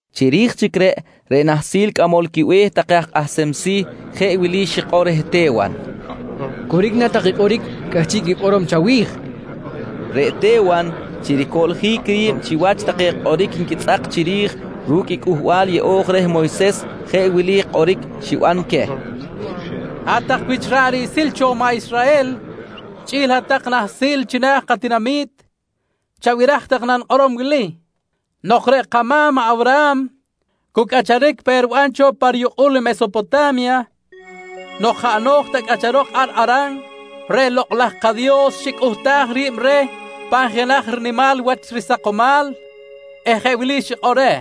Chiri̱j chic reꞌ, reꞌ nahsil cꞌamol quibe̱h take aj kꞌahsem si̱ jeꞌ wili xikꞌor reh Te̱wan: «Coric na take kꞌoric cꞌahchiꞌ quikꞌorom chawi̱j? nqui reh. Reꞌ Te̱wan chi ricoꞌljic ri̱b chiwach take kꞌoric nquitzꞌak chiri̱j ru̱cꞌ i Cꞌuhbal Yeꞌo̱j reh Moyses, jeꞌ wili kꞌoric xiban queh: «Hat-tak wich ra̱ꞌ riꞌsil cho maꞌ Israhel, chꞌi̱l hat-tak nahsil china̱ katinami̱t, chabiraj tak i nanikꞌorom wili: Nok reꞌ kama̱m maꞌ Awraham cu cꞌacharic pe riban cho pa riyukꞌul i Mesopota̱mya nok jaꞌ no̱j ta cꞌacharok ar Haran, reꞌ lokꞌ laj kaDios xicꞌuhtaj ri̱b reh pan jenaj rinimal wach risakomal eh jeꞌ wili xikꞌor reh: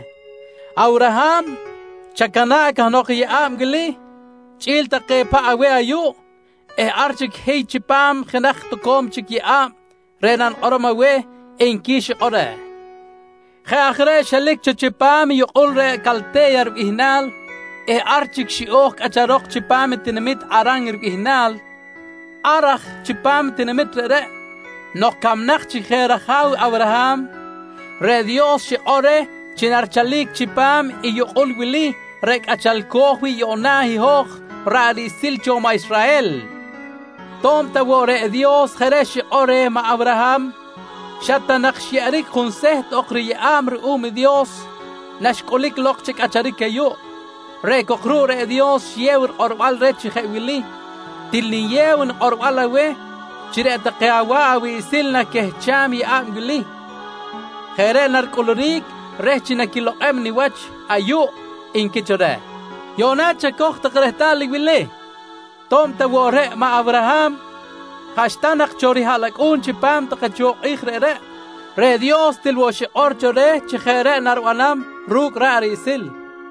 ‹Awraham, chacana̱ꞌ cahnok i yeꞌa̱b wili chꞌi̱l take paꞌ aweh ayuꞌ eh ar chic hiy chipam jenaj toco̱m chic yeꞌa̱b reꞌ nanikꞌorom aweh, nqui xikꞌor reh. Jeꞌ aj reꞌ xelic cho chipam i yukꞌul reꞌ Calte̱ya ribihnal eh ar chic xiꞌo̱j cꞌacharok chipam i tinamit Haran ribihnal. Ar aj chipam i tinamit reꞌreꞌ, nok camnak chic je raja̱w i Awraham, reꞌ Dios xikꞌor reh chi narichalic chipam i yukꞌul wili reꞌ cꞌachalco̱j wi̱ꞌ yuꞌna i hoj ra̱ꞌ riꞌsil cho maꞌ Israhel. To̱b ta woꞌ reꞌ Dios jeꞌ reꞌ xikꞌor reh maꞌ Awraham, xa ta nak xyeꞌeric junseht ok riyeꞌa̱b ruꞌum i Dios naxcꞌulic lok chi cꞌacharic ayuꞌ. Reꞌ cok ruꞌ reꞌ Dios xiyew rikꞌorbal reh chi jeꞌ wili: ‹Til niyew nikꞌorbal aweh chi reꞌ take awa̱ꞌ awiꞌsil naquehcham i yeꞌa̱b wili. Jeꞌ reꞌ naricꞌuluric reh chi naquilokꞌem niwach ayuꞌ, nqui cho reh. «Yuꞌna chacoj tak rehtal i wili: To̱b ta woꞌ reꞌ maꞌ Awraham jaꞌxta nak cho rihaꞌlacꞌu̱n chipam take cho kꞌi̱j reꞌreꞌ, reꞌ Dios til woꞌ xikꞌor cho reh chi jeꞌ reꞌ naribanam ru̱cꞌ ra̱ꞌ riꞌsil.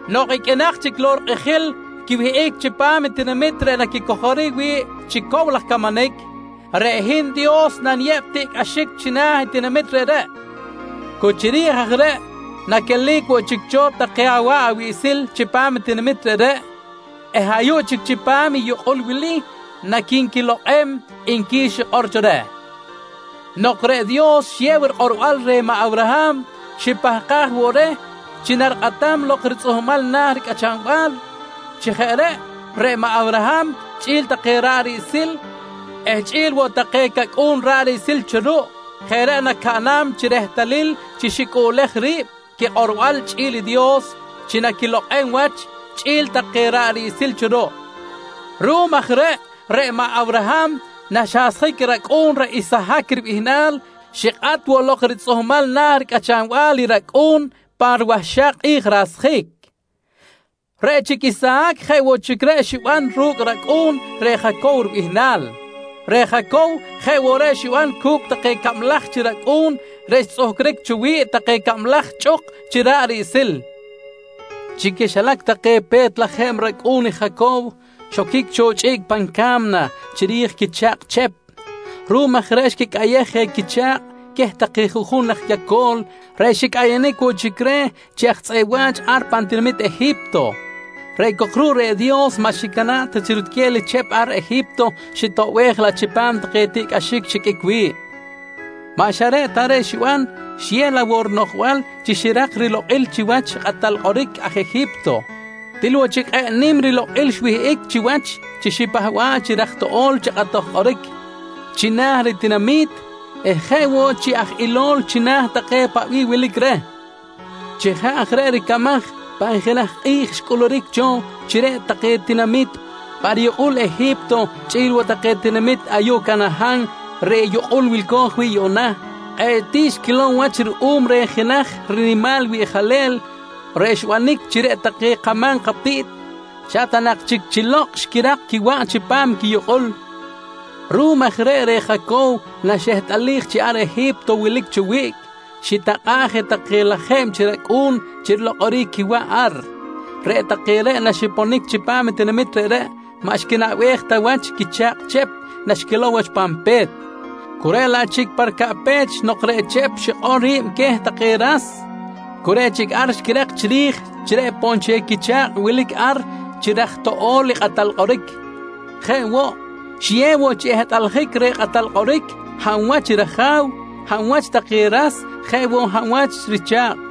Nok iqꞌuinak chic lok rikꞌijil quiwihꞌic chipam i tinamit reꞌ naquicojoric wi̱ꞌ chi cow laj camanic, reꞌ hin Dios naniyeb tiꞌcꞌaxic china̱ i tinamit reꞌreꞌ. Cu chiri̱j aj reꞌ naquelic woꞌ chic cho take awa̱ꞌ awiꞌsil chipam i tinamit reꞌreꞌ eh ayuꞌ chic chipam i yukꞌul wili naqui̱nquilokꞌem, nqui xikꞌor cho reh. «Nok reꞌ Dios xiyew rikꞌorbal reh maꞌ Awraham, xipahkaj woꞌ reh chi narikꞌatam lok ritzꞌuhmal na̱ ricꞌachanbal. Chi jeꞌ reꞌ, reꞌ maꞌ Awraham chꞌi̱l take ra̱ꞌ riꞌsil eh chꞌi̱l woꞌ take cacꞌu̱n ra̱ꞌ riꞌsil cho ruꞌ, jeꞌ reꞌ nacaꞌnam chi rehtalil chi xicꞌuꞌlej ri̱b quikꞌorbal chꞌi̱l i Dios chi naquilokꞌem wach chꞌi̱l take ra̱ꞌ riꞌsil cho ruꞌ. Ruꞌum aj reꞌ, reꞌ maꞌ Awraham naxasjic i racꞌu̱n reꞌ Isahac ribihnal, xikꞌat woꞌ lok ritzꞌuhmal na̱ ricꞌachanbal i racꞌu̱n pa riwahxak kꞌi̱j rasjic. Reꞌ chic Isahac jeꞌ woꞌ reꞌ xiban ru̱cꞌ racꞌu̱n, reꞌ Jacow ribihnal. Reꞌ Jacow jeꞌ woꞌ reꞌ xiban cu̱cꞌ take cablaj chi racꞌu̱n reꞌ xtzꞌuhcric cho wi̱ꞌ take cablaj chꞌuk chi ra̱ꞌ riꞌsil. «Chi quixilac take pe̱t lajeb racꞌu̱n i Jacow xoquic cho chꞌiꞌc pan ca̱mna chiri̱j i quicha̱kꞌ Chep. Ruꞌum aj reꞌ xquicꞌayej je quicha̱kꞌ queh take juꞌjun aj yaco̱l reꞌ xicꞌayanic woꞌ chic reh chi aj tzꞌeꞌ wa̱ch ar pan tinamit Eji̱pto. Reꞌ cok ruꞌ, reꞌ Dios maꞌ xicana̱ꞌ ta chi rutquel i Chep ar Eji̱pto, xitoꞌbej laꞌ chipam take tiꞌcꞌaxic xiqꞌuic wi̱ꞌ. Maꞌ xa reꞌ ta reꞌ xiban, xiyew laꞌ woꞌ rinoꞌjbal chi xirak rilokꞌil chiwach i kꞌatal kꞌoric aj Eji̱pto. Til woꞌ chic kꞌe̱ꞌ nim rilokꞌil xwihꞌic chiwach chi xipahba̱ꞌ chi raj toꞌo̱l chi kꞌatoj kꞌoric china̱ ritinami̱t eh jeꞌ woꞌ chi aj ilol china̱ take paꞌ bih wilic reh. Chi jeꞌ aj reꞌ ricamaj, pan jenaj kꞌi̱j xcꞌuluric cho chi reꞌ take tinamit pa riyukꞌul i Eji̱pto chꞌi̱l woꞌ take tinamit ayuꞌ Canahan reꞌ yukꞌul wilco̱j wi̱ꞌ yuꞌna, kꞌe̱ꞌ tiꞌ xquilow wach ruꞌum reh jenaj rinimal wiꞌjalel reꞌ xbanic chi reꞌ take kama̱m katiꞌt xa ta nak chic chi lokꞌ xquirak quiwaꞌ chipam i quiyukꞌul. Ruꞌum aj reꞌ, reꞌ Jacow naxehtꞌalij chi ar Eji̱pto wilic cho wiꞌc, xitakꞌa̱ꞌ je take lajeb chi racꞌu̱n chi rilokꞌoric quiwaꞌ ar. «Reꞌ take reꞌ naxiponic chipam i tinamit reꞌreꞌ maꞌ xquinaꞌbej ta wach i quicha̱kꞌ Chep naxquilow wach pan pe̱t, cu reꞌ laꞌ chic pa ricaꞌpech nok reꞌ Chep xikꞌor ri̱b queh take ras, cu reꞌ chic ar xquirak chiri̱j chi reꞌ poꞌ nchel quicha̱kꞌ wilic ar chi raj toꞌo̱l i kꞌatal kꞌoric. Jeꞌ woꞌ, xiyew woꞌ chi ehtꞌaljic reh kꞌatal kꞌoric hab wach i raja̱w, hab wach take ras jeꞌ woꞌ hab wach i richa̱kꞌ.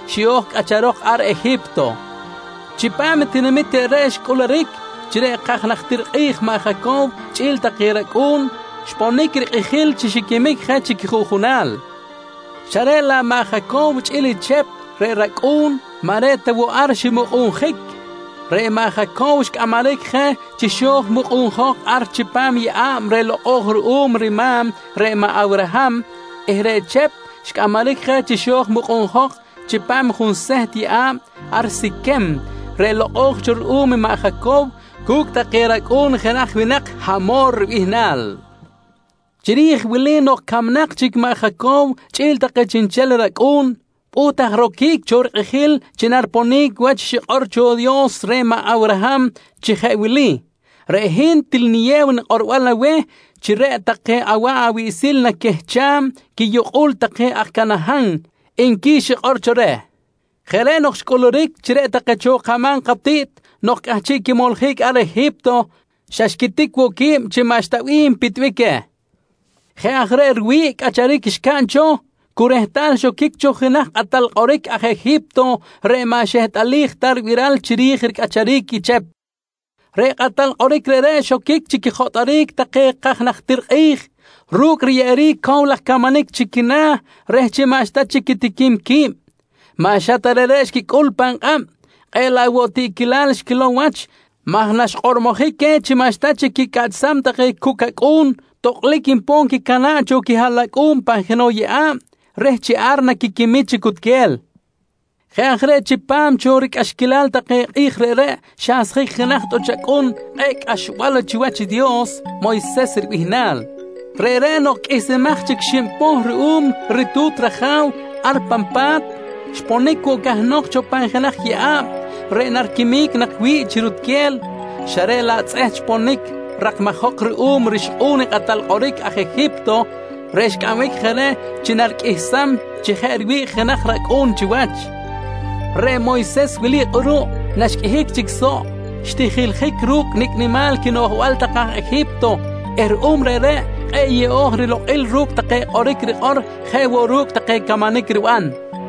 xiꞌo̱j cꞌacharok ar Eji̱pto. «Chipam i tinamit reꞌreꞌ xcꞌuluric chi reꞌ kaj najtir kꞌi̱j maꞌ Jacow chꞌi̱l take racꞌu̱n, xponic rikꞌijil chi xiquimic je chi quijuꞌjunal. Xa reꞌ laꞌ maꞌ Jacow chꞌi̱l i Chep reꞌ racꞌu̱n, maꞌ reꞌ ta woꞌ ar ximukꞌunjic. Reꞌ maꞌ Jacow xcꞌamaric je chi xo̱j mukꞌunjok ar chipam i yeꞌa̱b reꞌ lokꞌo̱j ruꞌum i rima̱m reꞌ maꞌ Awraham eh reꞌ Chep xcꞌamaric je chi xo̱j mukꞌunjok chipam i junseht yeꞌa̱b ar Siquem reꞌ lokꞌo̱j cho ruꞌum i maꞌ Jacow cu̱cꞌ take racꞌu̱n i jenaj winak Hamor ribihnal. «Chiri̱j wili nok camnak chic maꞌ Jacow chꞌi̱l take chiꞌnchel racꞌu̱n, pꞌuht aj roquic cho rikꞌijil chi nariponic wach i xikꞌor cho i Dios reh maꞌ Awraham chi jeꞌ wili: ‹Reꞌ hin til niyew nikꞌorbal aweh chi reꞌ take awa̱ꞌ awiꞌsil naquehcham quiyukꞌul take aj Canahan, nqui xikꞌor cho reh. «Jeꞌ reꞌ nok xcꞌuluric chi reꞌ take cho kama̱m katiꞌt nok cꞌahchiꞌ quimoljic ar Eji̱pto, xa xquitic woꞌ qui̱b chi maꞌxta bih npitbic queh. Jeꞌ aj reꞌ riwi̱ꞌ cꞌacharic xcaꞌn cu rehtal xoquic cho jenaj kꞌatal kꞌoric aj Eji̱pto reꞌ maꞌ xehtꞌalij ta ribiral chiri̱j ricꞌacharic i Chep. Reꞌ kꞌatal kꞌoric reꞌreꞌ xoquic chi quijotꞌoric take kaj najtir kꞌi̱j ru̱cꞌ riyeꞌeric cow laj camanic chi quina̱ reh chi maꞌxta chic quitiquim qui̱b. Maꞌ xa ta reꞌreꞌ xquicꞌul pan kꞌab, kꞌe̱ꞌ laꞌ woꞌ tiꞌquilal xquilow wach maj naxkꞌormojic queh chi maꞌxta chic quicꞌaꞌchsam take cucꞌ cacꞌu̱n, tokꞌlic npon quicana̱ꞌ cho quihaꞌlacꞌu̱n pan jenoꞌ yeꞌa̱b reh chi ar naquiquimic chi cutquel. «Jeꞌ aj reꞌ chipam cho ricꞌaxquilal take kꞌi̱j reꞌreꞌ xasjic jenaj tꞌuch acꞌun kꞌe̱ꞌ cꞌaxbal wach chiwach i Dios, Moyses ribihnal. Reꞌreꞌ nok qꞌuihsimaj chic xib poh ruꞌum ritu̱t raja̱w ar pan pa̱t, xponic woꞌ cahnok cho pan jenaj yeꞌa̱b reꞌ nariquimic nak wi̱ꞌ chi rutquel xa reꞌ laꞌ tzꞌeht xponic rakmajok ruꞌum rixkꞌu̱n i kꞌatal kꞌoric aj Eji̱pto, reꞌ xcꞌambic je reh chi nariqꞌuihsam chi jeꞌ riwi̱ꞌ jenaj racꞌu̱n chiwach. Reꞌ Moyses wili kꞌuruꞌ naxqꞌuihic chic soꞌ, xtijiljic ru̱cꞌ nicꞌ nimal quinoꞌjbal take aj Eji̱pto eh ruꞌum reꞌreꞌ kꞌe̱ꞌ yeꞌo̱j rilokꞌil ru̱cꞌ take kꞌoric rikꞌor jeꞌ woꞌ reꞌ ru̱cꞌ take camanic riban.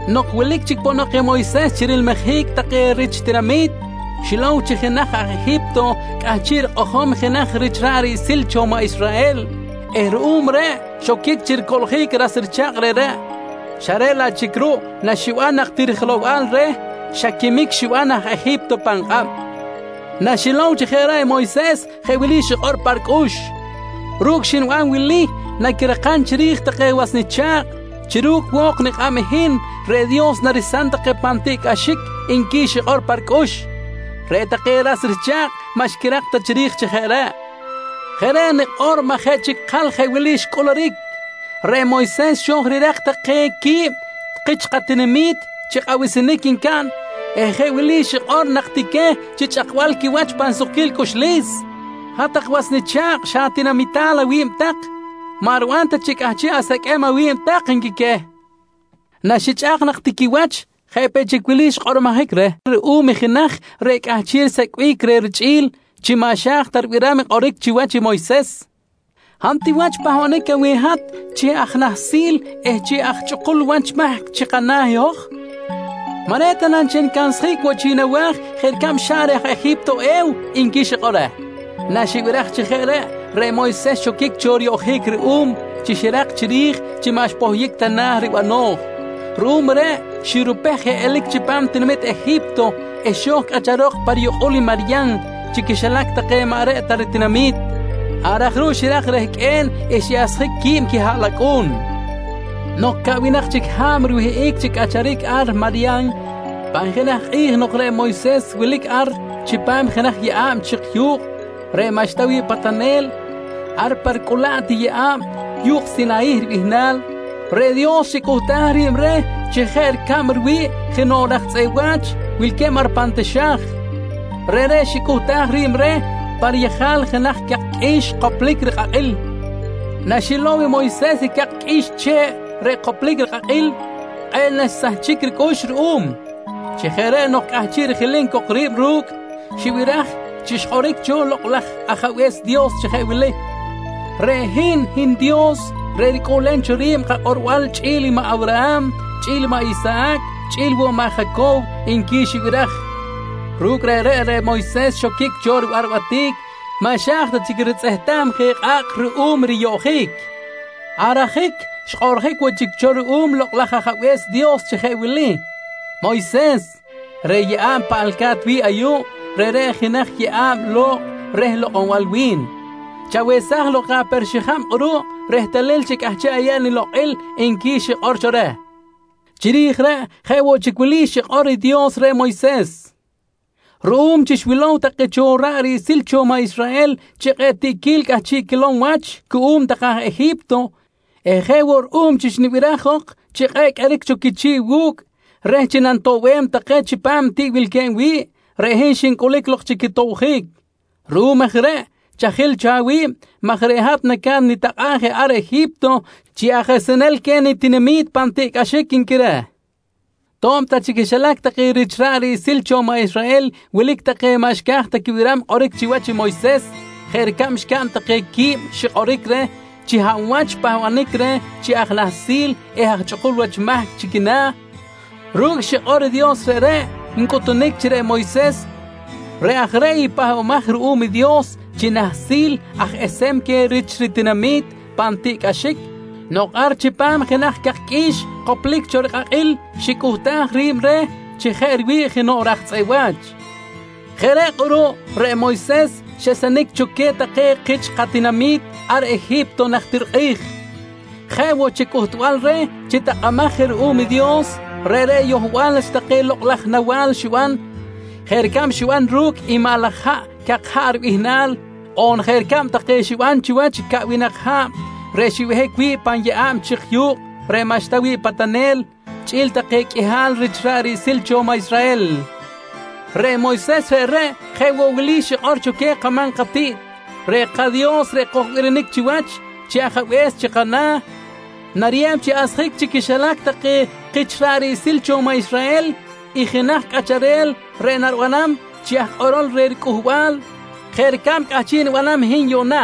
Nok wilic chic ponok i Moyses chi rilmijic take rich tinamit, xilow chi jenaj aj Eji̱pto cꞌahchiꞌ rikꞌojom jenaj rich ra̱ꞌ riꞌsil cho maꞌ Israhel eh ruꞌum reꞌ xoquic chi ricoꞌljic i ras richa̱kꞌ reꞌreꞌ, xa reꞌ laꞌ chic ruꞌ naxiban nak ti rijelow-bal reh, xa quimic xiban aj Eji̱pto pan kꞌab. Naxilow chi jeꞌ reꞌ i Moyses, jeꞌ wili xikꞌor pa ricꞌux: ‹Ru̱cꞌ xniban wili, naquirakam chiri̱j take was nicha̱kꞌ chi ru̱cꞌ wo̱k nikꞌab i hin reꞌ Dios naresam take pan tiꞌcꞌaxic, nqui xikꞌor pa ricꞌux. «Reꞌ take ras richa̱kꞌ maꞌ xquirak ta chiri̱j chi jeꞌ reꞌ. Jeꞌ reꞌ nikꞌor maj jeꞌ chic ikal jeꞌ wili xcꞌuluric: Reꞌ Moyses xo̱j rirak take quib kich katinami̱t chi kꞌabisinic ncaꞌn eh jeꞌ wili xikꞌor nak ti queh chi chꞌakbal quiwach pan sukquil cꞌuxlis: ‹Hat-tak was nicha̱kꞌ, xa atinamital awi̱b tak. Maꞌ riban ta chi cꞌahchiꞌ aseqꞌuem awi̱b tak, nqui queh. «Naxichꞌak nak ti quiwach jeꞌ peꞌ chic wili xkꞌormojic reh ruꞌum i jenaj reꞌ cꞌahchiꞌ risecꞌbic reh richꞌi̱l chi maꞌ xa̱j ta ribiram kꞌoric chiwach i Moyses: ‹Hab ti wach pahbanic aweh i hat chi aj nahsil eh chi aj chꞌukul wach mahc chi kana̱ i hoj? Maꞌ reꞌ ta na nchel nicansjic woꞌ chic nawa̱j jeꞌ ricab xaꞌn reh aj Eji̱pto e̱w? nqui xikꞌor reh. «Naxibiraj chi jeꞌ reꞌ, reꞌ Moyses xoquic cho riyoꞌjic ruꞌum chi xirak chiri̱j chi maꞌ xpohyic ta na̱ ribano̱j. Ruꞌum reꞌ, xirupej je elic chipam i tinamit Eji̱pto eh xo̱j cꞌacharok pa riyukꞌul i Maryan chi quixilac take maꞌ reꞌ ta ritinami̱t. Ar aj ruꞌ xirak rehqꞌue̱n eh xiꞌasjic quib quihaꞌlacꞌu̱n. «Nok caꞌwinak chic ha̱b riwihꞌic chi cꞌacharic ar Maryan, pan jenaj kꞌi̱j nok reꞌ Moyses wilic ar chipam jenaj yeꞌa̱b chik yu̱kꞌ reꞌ maꞌxta wi̱ꞌ patanel ar pa ricꞌulaꞌt i yeꞌa̱b Yu̱kꞌ Sinayih ribihnal, reꞌ Dios xicꞌuhtaj ri̱b reh chi jeꞌ ricab riwi̱ꞌ jenoꞌ raj tzꞌeꞌ wa̱ch wilque̱b ar pan taxa̱j. Reꞌreꞌ xicꞌuhtaj ri̱b reh pan yejal jenaj cak qꞌui̱x koplic rikꞌakꞌil. Naxilow i Moyses i cak qꞌui̱x che̱ꞌ reꞌ xkop rikꞌakꞌil, kꞌe̱ꞌ naxsahchic ricꞌux ruꞌum. Chi jeꞌ reꞌ nok cꞌahchiꞌ rijilim cok ri̱b ru̱cꞌ, xibiraj chi xkꞌoric cho i Lokꞌ laj Ajabe̱s Dios chi jeꞌ wili: ‹Reꞌ hin, hin i Dios reꞌ ricꞌuꞌlem cho ri̱b kakꞌorbal chꞌi̱l i maꞌ Awraham, chꞌi̱l i maꞌ Isahac chꞌi̱l woꞌ i maꞌ Jacow, nqui xibiraj. «Ru̱cꞌ reꞌreꞌ, reꞌ Moyses xoquic cho ribarbatic maꞌ xa̱j ta chic ritzꞌehtam je kꞌa̱kꞌ ruꞌum riyoꞌjic. Ar ajic xkꞌoꞌrjic woꞌ chic cho ruꞌum i Lokꞌ laj Ajabe̱s Dios chi jeꞌ wili: ‹Moyses, reꞌ yeꞌa̱b paꞌalca̱t wi̱ꞌ ayuꞌ, reꞌreꞌ jenaj yeꞌa̱b lo̱kꞌ reh lokꞌonbal wi̱n. Chawesaj lok aper-xijab kꞌuruꞌ rehtalil chi cꞌahchiꞌ ayeb nilokꞌil, nqui xikꞌor cho reh. «Chiri̱j reꞌ, jeꞌ woꞌ chic wili xikꞌor i Dios reh Moyses: ‹Ruꞌum chi xwilow take cho ra̱ꞌ riꞌsil cho maꞌ Israhel chi kꞌe̱ꞌ tiꞌquil cꞌahchiꞌ quilom wach cuꞌum take aj Eji̱pto eh jeꞌ woꞌ ruꞌum chi xnibiraj jok chi kꞌe̱ꞌ qꞌueric cho quichi̱ꞌ wu̱cꞌ reh chi nanitoꞌbem take chipam i tiꞌ wilque̱b wi̱ꞌ, reꞌ hin xincꞌulic lok chi quitobjic. Ruꞌum aj reꞌ chajil cho awi̱b maj reꞌ hat naca̱t nitakꞌa̱b je ar Eji̱pto chi aj esenel queh nitinami̱t pan tiꞌcꞌaxic, nqui reh. «To̱b ta chi quixilac take rich ra̱ꞌ riꞌsil cho maꞌ Israhel wilic take maꞌ xca̱j ta quibiram kꞌoric chiwach i Moyses jeꞌ ricab xcaꞌn take qui̱b xikꞌoric reh chi hab wach xpahbanic reh chi aj nahsil eh chi aj chꞌukul wach mahc chi quina̱, ru̱cꞌ xikꞌor i Dios reꞌreꞌ ncꞌutunic chi reꞌ Moyses reꞌ aj reꞌ i pahbamaj ruꞌum Dios chi nahsil aj esem queh rich ritinami̱t pan tiꞌcꞌaxic nok ar chipam jenaj cak qꞌui̱x koplic cho rikꞌakꞌil xicꞌuhtaj ri̱b reh chi jeꞌ riwi̱ꞌ jenoꞌ raj tzꞌeꞌ wa̱ch. Jeꞌ reꞌ kꞌuruꞌ reꞌ Moyses xesenic cho queh take kich katinami̱t ar Eji̱pto najtir kꞌi̱j. Jeꞌ woꞌ chi cꞌuhtbal reh chi takꞌamaj je ruꞌum i Dios, reꞌreꞌ yohbal wach take lokꞌ laj nawa̱l xiban jeꞌ ricab xiban ru̱cꞌ i maꞌ laj haꞌ “Cak Haꞌ” ribihnal on jeꞌ ricab take xiban chiwach caꞌwinak ha̱b reꞌ xbehic wi̱ꞌ pan yeꞌa̱b chik yu̱kꞌ reꞌ maꞌxta wi̱ꞌ patanel chꞌi̱l take qꞌuihal rich ra̱ꞌ riꞌsil cho maꞌ Israhel. Reꞌ Moyses reꞌreꞌ, jeꞌ woꞌ wili xikꞌor cho queh kama̱m katiꞌt: ‹Reꞌ kaDios reꞌ kojbirinic chiwach chi ajabe̱s chi kana̱ nariyeb chi asjic chi quixilac take kich ra̱ꞌ riꞌsil cho maꞌ Israhel i jenaj cꞌacharel reꞌ naribanam chi aj kꞌorol reh ricꞌuhbal jeꞌ ricab cꞌahchiꞌ nibanam i hin yuꞌna.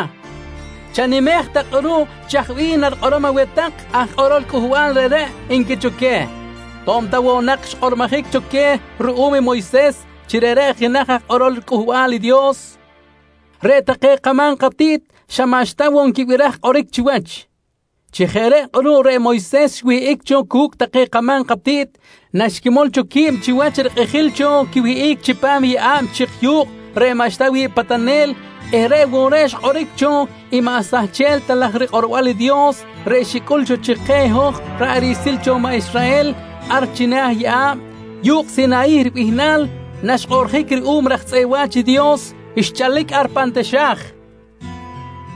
Chanimej tak kꞌuruꞌ chaj bih narikꞌorom aweh tak aj kꞌorol cꞌuhbal reꞌreꞌ, nqui cho queh. «To̱b ta woꞌ nak xkꞌormojic cho queh ruꞌum i Moyses chi reꞌreꞌ jenaj aj kꞌorol riCꞌuhbal i Dios, reꞌ take kama̱m katiꞌt xa maꞌxta woꞌ nquibiraj kꞌoric chiwach. Chi jeꞌ reꞌ kꞌuruꞌ reꞌ Moyses xwihꞌic cho cu̱cꞌ take kama̱m katiꞌt naxquimol cho qui̱b chiwach i rikꞌijil cho quiwihꞌic chipam i yeꞌa̱b chik yu̱kꞌ reꞌ maꞌxta wi̱ꞌ patanel eh reꞌ woꞌ reꞌ xkꞌoric cho i maꞌ sahchel ta laj riKꞌorbal i Dios reꞌ xicꞌul cho chi keh i hoj ra̱ꞌ riꞌsil cho maꞌ Israhel ar china̱ yeꞌa̱b “Yu̱kꞌ Sinayih” ribihnal naxkꞌoꞌrjic ruꞌum i raj tzꞌeꞌ wa̱ch i Dios xchalic ar pan taxa̱j.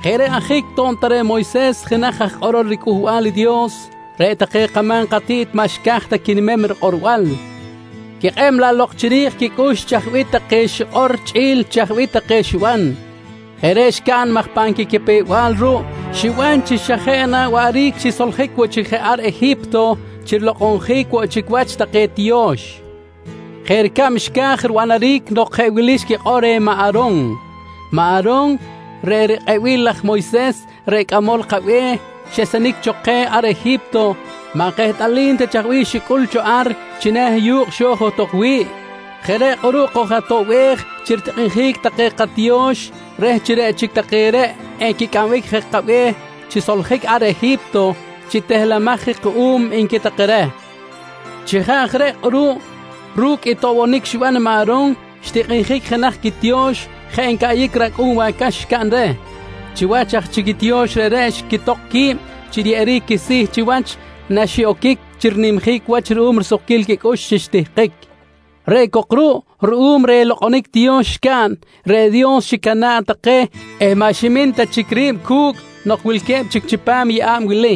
«Jeꞌ reꞌ ajic to̱b ta reꞌ Moyses jenaj woꞌ aj kꞌorol riCꞌuhbal i Dios, reꞌ take kama̱m katiꞌt maꞌ xca̱j ta quinimem rikꞌorbal, xquikꞌeb laꞌ lok chiri̱j quicꞌux chaj bih take xikꞌor chꞌi̱l chaj bih take xiban. Jeꞌ reꞌ xcaꞌn maj pan quicapew-bal ruꞌ xiban chi xa jeꞌ na waꞌric xisoljic woꞌ chic je ar Eji̱pto chi rilokꞌonjic woꞌ chic wach take tiyo̱x, jeꞌ ricab xca̱j ribanaric nok jeꞌ wili xquikꞌor reh maꞌ A̱ron: ‹Maꞌ A̱ron, reꞌ rikꞌebil laj Moyses reꞌ cꞌamol kabe̱h xesenic cho keh ar Eji̱pto maꞌ kehtꞌalim ta chaj bih xicꞌul cho ar china̱ i yu̱kꞌ xo̱j johtok wi̱ꞌ. Jeꞌ reꞌ kꞌuruꞌ koj-atoꞌbej chi ritikꞌinjic take katiyo̱x reh chi reꞌ chic take reꞌ equicꞌambic je kabe̱h chi soljic ar Eji̱pto chi tehlemaj je kuꞌum, nqui take reh. «Chi jeꞌ aj reꞌ kꞌuruꞌ ru̱cꞌ i toꞌbonic xiban maꞌ A̱ron, xtikꞌinjic jenaj quitiyo̱x jeꞌ ncaꞌyic racꞌu̱n wacax xcaꞌn reh. Chiwach aj chic i tiyo̱x reꞌreꞌ xquitok qui̱b chi riyeꞌeric quisi̱ chiwach naxiꞌoquic chi rinimjic wach ruꞌum risukquil quicꞌux chi xtihkic. Reꞌ cok ruꞌ ruꞌum reh lokꞌonic tiyo̱x xcaꞌn, reꞌ Dios xicana̱ꞌ take eh maꞌ ximin ta chic ri̱b cu̱cꞌ nok wilque̱b chic chipam yeꞌa̱b wili.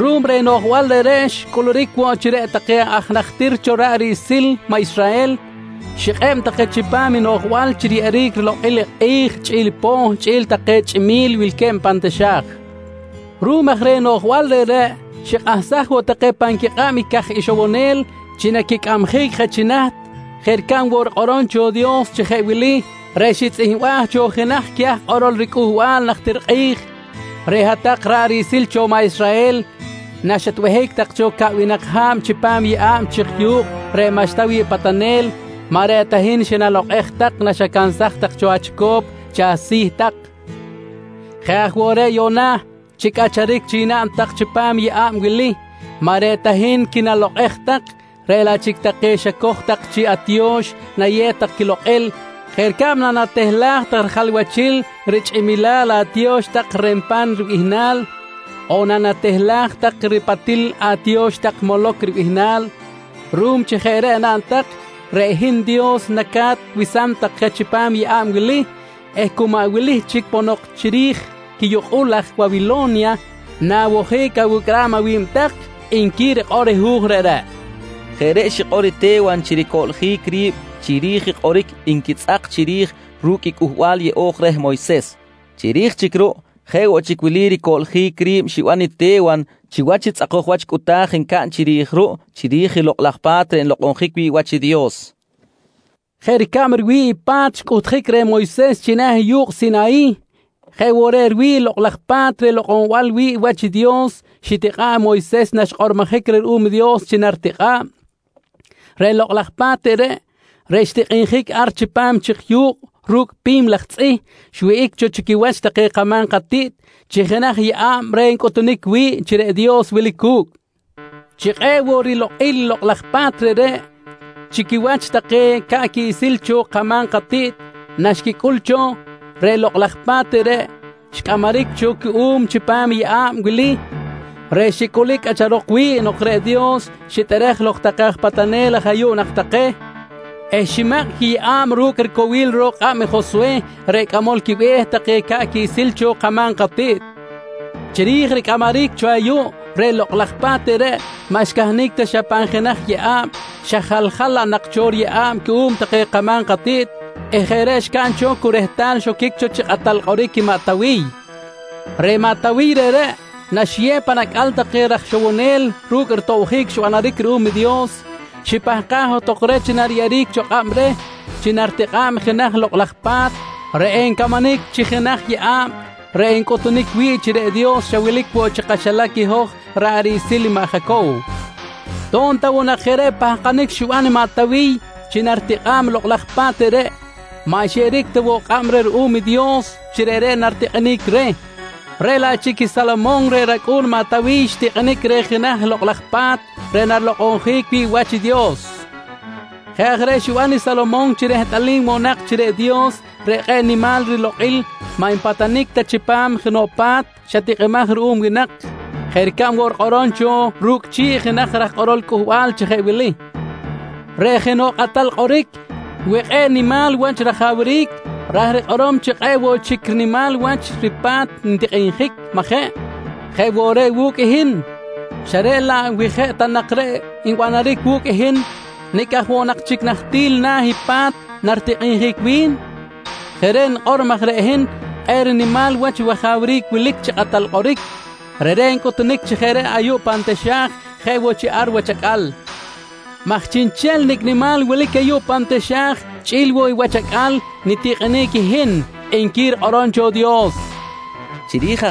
Ruꞌum reh noꞌjbal reꞌreꞌ xcꞌuluric woꞌ chi reꞌ take aj najtir cho ra̱ꞌ riꞌsil cho maꞌ Israhel, xikꞌeb take chipam i noꞌjbal chi riyeꞌeric rilokꞌil i kꞌi̱j chꞌi̱l i poh chꞌi̱l woꞌ take chꞌimi̱l wilque̱b pan taxa̱j. Ruꞌum aj reh noꞌjbal reꞌreꞌ, xikꞌahsaj woꞌ take pan quikꞌab caj ixowonel chi naquicꞌamjic je chi naht, jeꞌ ricab woꞌ rikꞌorom cho i Dios chi jeꞌ wili reꞌ xitzꞌihmbaj cho jenaj queh aj kꞌorol riCꞌuhbal najtir kꞌi̱j: “Reꞌ hat-tak ra̱ꞌ riꞌsil cho maꞌ Israhel naxatbehic tak cho caꞌwinak ha̱b chipam yeꞌa̱b chik yu̱kꞌ reꞌ maꞌxta wi̱ꞌ patanel, maꞌ reꞌ ta hin xinalokꞌej tak naxacansaj tak cho achico̱p chi asi̱ tak. Jeꞌ aj woꞌ reꞌ yuꞌna chi cꞌacharic chic naꞌn tak chipam i yeꞌa̱b wili, maꞌ reꞌ ta hin quinalokꞌej tak, reꞌ laꞌ chic take xacoj tak chi atiyo̱x nayew tak quilokꞌil jeꞌ ricab nanatehlaj tak rijalwachil richꞌimilal atiyo̱x tak “Renpan” ribihnal, on nanatehlaj tak i ripatil atiyo̱x tak “Moloc” ribihnal. Ruꞌum chi jeꞌ reꞌ naꞌn tak, reꞌ hin Dios naca̱t wesam tak je chipam yeꞌa̱b wili eh cu maꞌ wili chic ponok chiri̱j quiyukꞌul aj Wawilo̱nya na̱wojic awicꞌram awi̱b tak, nqui rikꞌor Hu̱j reꞌreꞌ, nqui Te̱wan. Jeꞌ reꞌ xikꞌor i Te̱wan chi ricoꞌljic ri̱b chiri̱j i kꞌoric nquitzꞌak chiri̱j ru̱cꞌ Cꞌuhbal yeꞌo̱j reh Moyses. Chiri̱j chic ruꞌ jeꞌ woꞌ chic wili ricoꞌljic ri̱b xiban i Te̱wan chiwach i tzꞌakoj wach cꞌuta̱j ncaꞌn chiri̱j ruꞌ, chiri̱j i Lokꞌ laj Pa̱t reꞌ nlokꞌonjic wi̱ꞌ wach i Dios: «Jeꞌ ricab riwi̱ꞌ i pa̱t xcꞌuhtjic reh Moyses china̱ i yu̱kꞌ Sinayih, jeꞌ woꞌ reꞌ riwi̱ꞌ i Lokꞌ laj Pa̱t reꞌ lokꞌonbal wi̱ꞌ wach i Dios xitikꞌa̱ꞌ i Moyses naxkꞌormojic reh ruꞌum i Dios chi naritikꞌa̱b. Reꞌ lokꞌ laj pa̱t reꞌreꞌ, reꞌ xtikꞌinjic ar chipam chik yu̱kꞌ ru̱cꞌ pi̱m laj tzꞌih xwihꞌic cho chi quiwach take kama̱m katiꞌt chi jenaj yeꞌa̱b reꞌ ncꞌutunic wi̱ꞌ chi reꞌ Dios wilic cu̱cꞌ. Chi kꞌe̱ꞌ woꞌ rilokꞌil i lokꞌ laj pa̱t reꞌreꞌ chi quiwach take ca̱ꞌ quiꞌsil cho kama̱m katiꞌt naxquicꞌul cho, reꞌ lokꞌ laj pa̱t reꞌreꞌ xcꞌamaric cho cuꞌum chipam i yeꞌa̱b wili reꞌ xicꞌulic cꞌacharok wi̱ꞌ nok reꞌ Dios xitꞌerej lok take patanel aj ayuꞌ nak take eh ximakꞌ i quiyeꞌa̱b ru̱cꞌ ricowil ro̱k kꞌab i Joswe reꞌ cꞌamol quibe̱h take ca̱ꞌ quiꞌsil cho kama̱m katiꞌt. «Chiri̱j ricꞌamaric cho ayuꞌ, reꞌ lokꞌ laj pa̱t reꞌreꞌ maꞌ xcahnic ta xa pan jenaj riyeꞌa̱b xa jaljal laꞌ nak cho riyeꞌa̱b cuꞌum take katinami̱t eh jeꞌ reꞌ xcaꞌn cho cu rehtal xoquic cho chi kꞌatal kꞌoric i maꞌ Tawiy. Reꞌ maꞌ Tawiy reꞌreꞌ naxiyew pan acꞌal take raj ixowonel ru̱cꞌ ritobjic xbanaric ruꞌum i Dios, xipahkaj johtok reh chi nariyeꞌeric cho kꞌab reh chi naritikꞌa̱b jenaj lokꞌ laj pa̱t reꞌ encamanic chi jenaj yeꞌa̱b reꞌ encꞌutunic wi̱ꞌ chi reꞌ Dios xa wilic woꞌ chi kaxilac i hoj ra̱ꞌ riꞌsil cho maꞌ Jacow. To̱b ta woꞌ jeꞌ reꞌ pahkanic xiban i maꞌ Tawiy chi naritikꞌa̱b i lokꞌ laj pa̱t reꞌreꞌ, maꞌ xyeꞌeric ta woꞌ kꞌab reh ruꞌum i Dios chi reꞌreꞌ naritikꞌinic reh, reꞌ laꞌ chic i Salomon reꞌ racꞌu̱n i maꞌ Tawiy xtikꞌinic reh jenaj Lokꞌ laj Pa̱t reꞌ narilokꞌonjic wi̱ꞌ wach i Dios. Jeꞌ aj reꞌ xiban i Salomon chi rehtꞌalim woꞌ nak chi reꞌ Dios reꞌ kꞌe̱ꞌ nimal rilokꞌil maꞌ npatanic ta chipam jenoꞌ pa̱t tikꞌimaj xa ruꞌum winak, jeꞌ ricab woꞌ rikꞌorom cho ru̱cꞌ chi̱ꞌ jenaj raj kꞌorol Cꞌuhbal chi jeꞌ wili: “Reꞌ jenoꞌ kꞌatal kꞌoric wi kꞌe̱ꞌ nimal wach rajawric, ra̱j rikꞌorom chi kꞌe̱ꞌ woꞌ chic nimal wach i ripa̱t ntikꞌinjic, majeꞌ? Jeꞌ woꞌ reꞌ wu̱cꞌ i hin, xa reꞌ laꞌ wi jeꞌ ta nak reꞌ nbanaric wu̱cꞌ i hin, nicꞌ aj woꞌ nak chic nahtil na̱ i pa̱t naritikꞌinjic wi̱n? Jeꞌ reꞌ nikꞌor maj reꞌ hin kꞌe̱ꞌ rinimal wach wajawric wilic chi kꞌatal kꞌoric, reꞌreꞌ ncꞌutunic chi jeꞌ reꞌ ayuꞌ pan taxa̱j jeꞌ woꞌ chi ar wach acꞌal maj chiꞌnchel nicꞌ nimal wilic ayuꞌ pan taxa̱j chꞌi̱l woꞌ i wach acꞌal nitikꞌinic i hin, nqui rikꞌorom cho i Dios, nqui Te̱wan.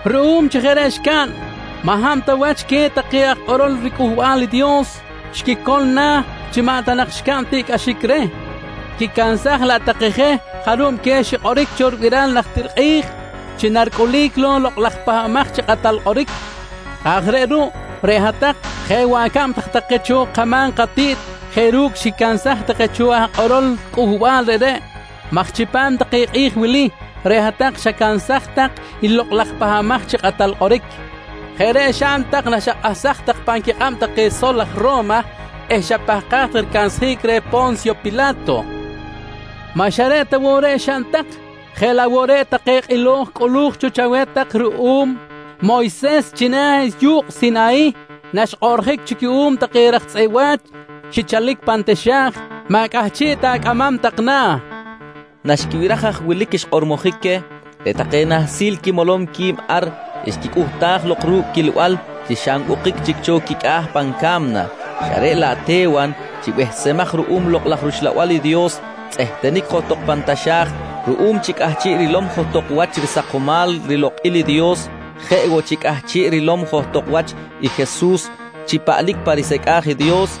Ruꞌum chi jeꞌ reꞌ xcaꞌn, maꞌ hab ta chic wach queh take aj kꞌorol riCꞌuhbal i Dios xquicol na̱ chi maꞌ ta nak xcaꞌn tiꞌcꞌaxic reh, xquicansaj laꞌ take je jarub queh xikꞌoric cho ribiral najtir kꞌi̱j chi naricꞌulic lok i lokꞌ laj Pahbamaj chi Kꞌatal Kꞌoric. Jeꞌ aj reꞌ ruꞌ, reꞌ hat-tak jeꞌ woꞌ acab tak take cho kama̱m katiꞌt jeꞌ ru̱cꞌ xquicansaj take cho aj kꞌorol cꞌuhbal reꞌreꞌ maj chipam take kꞌi̱j wili reꞌ hat-tak xacansaj tak i lokꞌ laj Pahbamaj chi Kꞌatal Kꞌoric. Jeꞌ reꞌ xaꞌn tak naxakꞌahsaj tak pan quikꞌab take sol aj Ro̱ma eh xapahkaj tak ricansjic reh Po̱nsyo Pila̱to. Maꞌ xa reꞌ ta woꞌ reꞌ xaꞌn tak, jeꞌ laꞌ woꞌ take kꞌilo̱j cꞌulu̱j cho chaweh tak ruꞌum Moyses china̱ i yu̱kꞌ Sinayih naxkꞌoꞌrjic cuꞌum take raj tzꞌeꞌ wa̱ch xichalic pan taxa̱j, maꞌ cꞌahchiꞌ ta acꞌamam tak na̱, nqui xikꞌor Te̱wan. Naxquibiraj haj wilic xkꞌormojic queh, reꞌ take nahsil quimolom qui̱b ar xquicꞌuhtaj lok ru̱cꞌ quilbal chi xa nwukꞌic chic cho quicꞌa̱ pan ca̱mna, xa reꞌ laꞌ Te̱wan chi behsemaj ruꞌum Lokꞌ laj rUxlabal i Dios tzꞌehtenic johtok pan taxa̱j ruꞌum chi cꞌahchiꞌ rilom johtok wach risakomal rilokꞌil i Dios, jeꞌ woꞌ chi cꞌahchiꞌ rilom johtok wach i Jesus chi paꞌlic pa risecꞌa̱j i Dios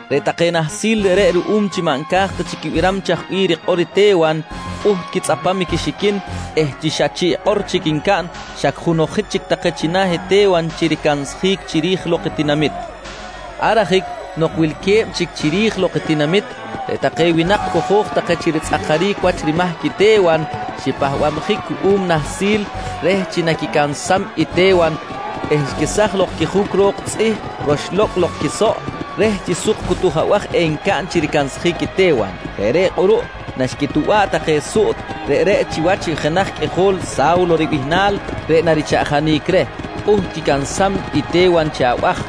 Reꞌ take nahsil reꞌreꞌ ruꞌum chi maꞌ nca̱j ta chic quibiram chaj bih rikꞌor i Te̱wan, pꞌuht quitzꞌapam quixiquin eh chi xa chiꞌkꞌor chic ncaꞌn, xa junojic chic take china̱ Te̱wan chi ricansjic chiri̱j lok i tinamit. Ar ajic nok wilque̱b chic chiri̱j lok i tinamit, reꞌ take winak cojo̱j take chi ritzꞌakaric wach rimahc i Te̱wan, xipahbabjic cuꞌum nahsil reh chi naquicansam i Te̱wan eh chi jeꞌ reꞌ xquesaj lok i quijuc ro̱k tzꞌih roxlo̱cꞌ lok quisoꞌ, reh chi suk cutuj abaj encaꞌn chi ricansjic i Te̱wan. Jeꞌ reꞌ kꞌuruꞌ naxquituba̱ꞌ take suꞌt reꞌreꞌ chiwach i jenaj qꞌuijol Sa̱wlo ribihnal reꞌ narichaꞌjanic reh, pꞌuht quicansam i Te̱wan chi abaj.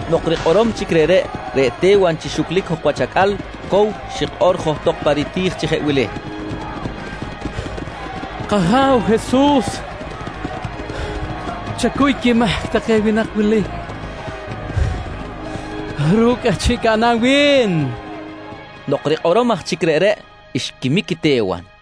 Nok rikꞌorom chic reꞌreꞌ, reꞌ Te̱wan chi xuclic jok wach acꞌal, cow xikꞌor johtok pa riti̱j chi jeꞌ wili: «K-Aja̱w Jesus, chacuy cho quimahc take winak wili ru̱cꞌ i cꞌahchiꞌ caꞌnam wi̱n, nqui xikꞌor johtok. Nok rikꞌorom aj chic reꞌreꞌ, xquimic i Te̱wan.